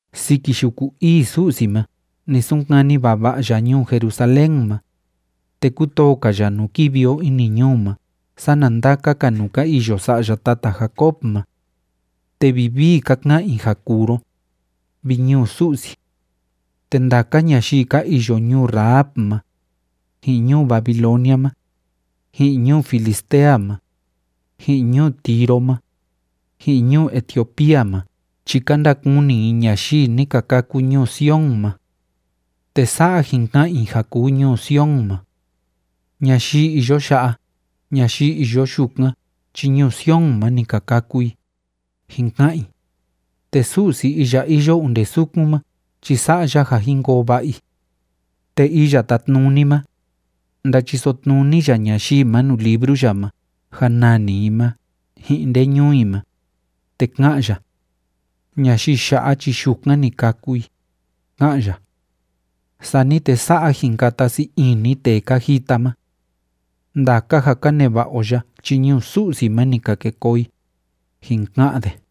Siki yuku ii Su'si ma ni sunkani vava'a ya ñuu Jerusalén ma. Te kútoo‑ka ya nuu kivi o ini ñuu ma sana ndaka‑ka nuu ka iyo sa'ya tata Jacob ma. Te vivii ka ka'an i ja kuu ro, vi ñuu Su'si. Te ndaka ñayii ka iyo ñuu Rahab ma, ji'in ñuu Babilonia ma, ji'in ñuu Filistea ma, ji'in ñuu Tiro ma, ji'in ñuu Etiopía ma chi ka ndakuni i ñayii ni ka kâku ñuu Sion ma. Te sa'a jin ka'an i ja kuu ñuu Sion ma: “Ñayii iyo ya'a, ñayii iyo yukan chi ñuu Sion ma ni ka kâku i”, jin ka'an i, te Su'si iya iyo onde sukun ma chi sa'a ya ja jin koo va'a i. Te Iya Tátnuni ma, ndáchiso tnuni ya ñayii ma nuu libru ya ma ja nani i ma ji'in nde ñuu i ma, te ká'an ya: “Ñayii ya'a chi yukan ni kâku i”, ká'an ya. Sani te sa'a jin kata sii ini tee ka jita ma: “Ndaka ja ka neva'a o ya chi ñuu Su'si ma ni ka ke koo i”, jin ka'an de.